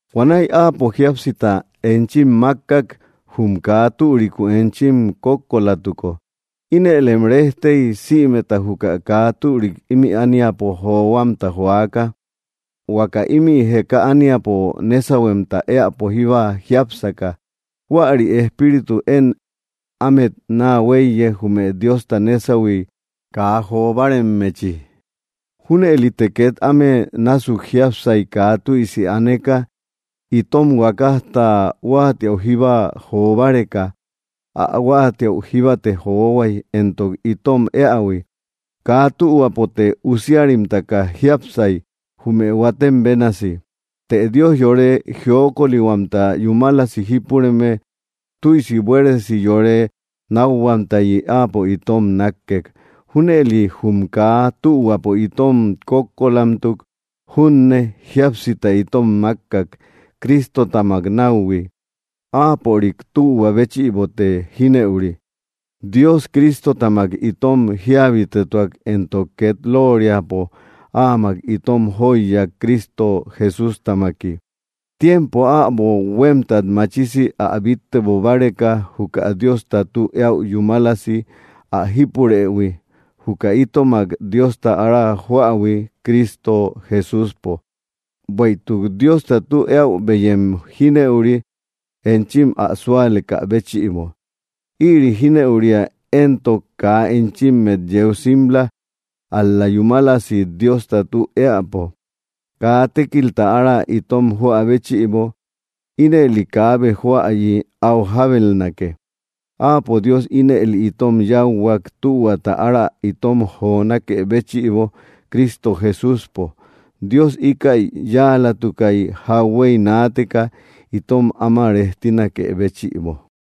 Huanäi Áapo jíapsita enchim mákkak, jum kaa türiku enchim kókkolatuko. Inëlem rejtey, sïmeta juka kaa türik ímï ániapo johuamta joaka, huaka ímï jeka ániapo nésahuemta éäpo jíba jiápsaka. Huäri espíritu én ámet naa huéiye, jume Diosta nésahui kaa jo báaremmechi. Júnëlite két áme násuk jiápsay, kaa tüisi aneka, itom huakajta huáatiäu jíba jo báreka. Ä huáatiäu jíbate johuay, entok itom éähui. Kaa tühuapote usiarimtaka jiápsay, jume huatem bénasi. Të Dios yore jiokolihuamta yúmalasi jípureme, tüisi buéresi yore nákhuamtayi Áapo itom nákkek. Júnëli jum kaa tühuapo itom kókkolamtuk junne, jíapsita itom mákkak, Cristotamak náuhui. Áapörik tühua béchïbote jínëuri. Dios Cristotamak itom jíabitetuak, entok két lóoriapo Áamak itom jóiyak, Cristo Jesústamaki, tiempo äbo huémtat machisi ä bíttebo báreka, juka Diosta tü eäu yúmalasi ä jípurëhui, juka itomak Diosta ára joähui Cristo Jesúspo. Bueïtuk Diosta tü eäu beyem jínëuri, enchim ä súalekä béchïbo. Ïri jínëuria éntok kaa enchimmet yeu simla, ál‑la yúmalasi Diosta tü éäpo, kaa tékilta ára itom joä béchïbo. Ínëli kaabe joäyi áu jábelnake. Áapo Dios ínëli itom yáuhuak, tühuata ára itom jonákë béchïbo, Cristo Jesúspo. Dios íkäi yáalatukay, jauhuey naateka, itom áma rejtinakë béchïbo.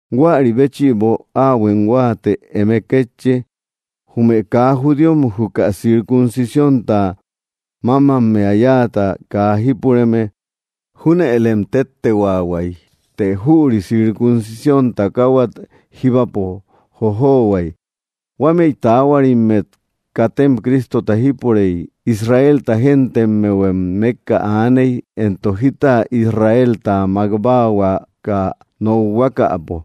Huäri béchïbo, áahuem huáate eme kétchi, jume kaa judíom, juka circuncisiónta mámammea yáata kaa jípureme, júnëlem téttehuaahuay. Të jüri circuncisión takahuat jíbapo jojohuay. Huámëi taahuarimmet katem Cristota jípurey; Israelta gentemmehuem mékka aaney. Entok jita Israelta mák báahuaka nokhuakapo,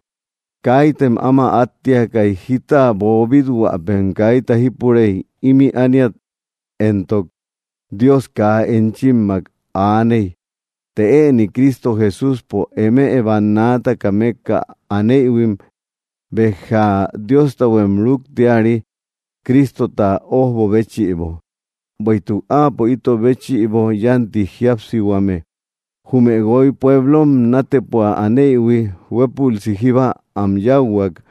kaitem áma áttiakay. Jíta boobít-huäpem kaita jípurey. Ímï ániat éntok, Dios kaa enchimmak aaney. Të ëni Cristo Jesúspo, eme bannaataka mékka aneïhuim béja Diostahuem rúktiari, Cristota ójbo béchïbo. Bueïtuk Áapo ito béchïbo yánti jíapsihuame. Jume guoy pueblom nátepua aneïhui huépülsi jíba am yáuhuak.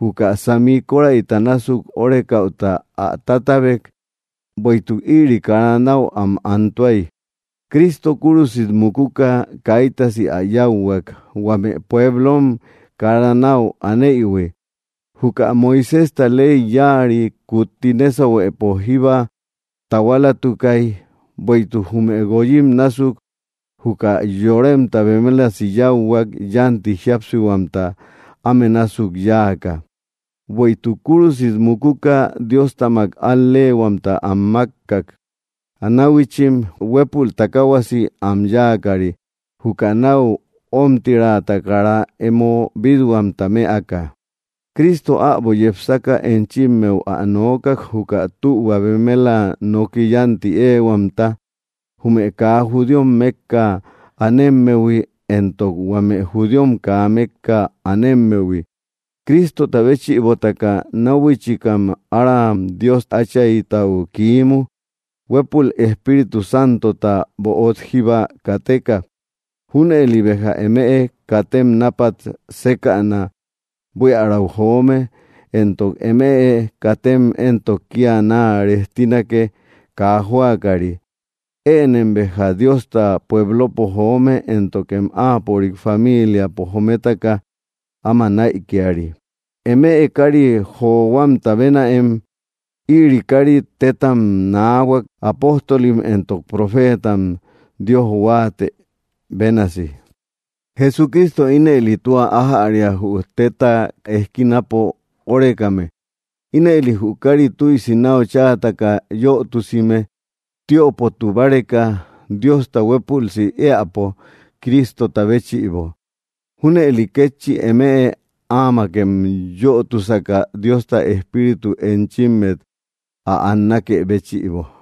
Juka sami kóräita násuk órekäuta ä tátabek; bueïtuk ïri kara náu am antuay. Cristo kúrusit mukuka kaitasi ä yáuhuak, huame pueblom kara náu aneïhui. Juka Moiséjta ley yáari kutti nésahuepo jíba tahualatukay. Bueïtuk jume guoyim násuk juka yoremta bemelasi yáuhuak, yánti jíapsihuamta áme násuk yáaka. Bueïtuk kúrusit mukuka Diostamak al‑leehuamta am mákkak, náhuichim, huépul takaahuasi am yáakari, juka náu ómtiraata kara emo bít-huamta mëaka. Cristo äbo yepsaka enchimmeu ä nookak, juka tühua bemela noki yánti éehuamta, jume kaa judíom mékka anemmehui, entok huame judíom kaa mékka anemmehui. Cristota béchïbotaka náhuichikam aram Dios Áchaytau kiimu, huépul Espíritu Santota böot jíba kateka. Júnëli béja emëe katem nápat sékäna buiärau joome, entok emëe katem entok kía naa rejtinake, kaa jóakari. Ënem béja Diosta pueblopo joome, éntokem Áapörik famiiliapo jometaka áma näikiari. Emëe kári johuamta bénaem. Ïri kári tétam naahuak, apóstolim entok profeetam Dios huáatë bénasi. Jesucristo ínëli tua ájäria, jü tétta ejkinapo órekame. Ínëli jü káari tüisi náu cháataka yötusime, tiöpotu báreka, Diosta huépülsi éäpo, Cristota béchïbo. Júnëli kétchi, eme áamakem yötusaka, Diosta Espíritu enchimmet ä annakë béchïbo.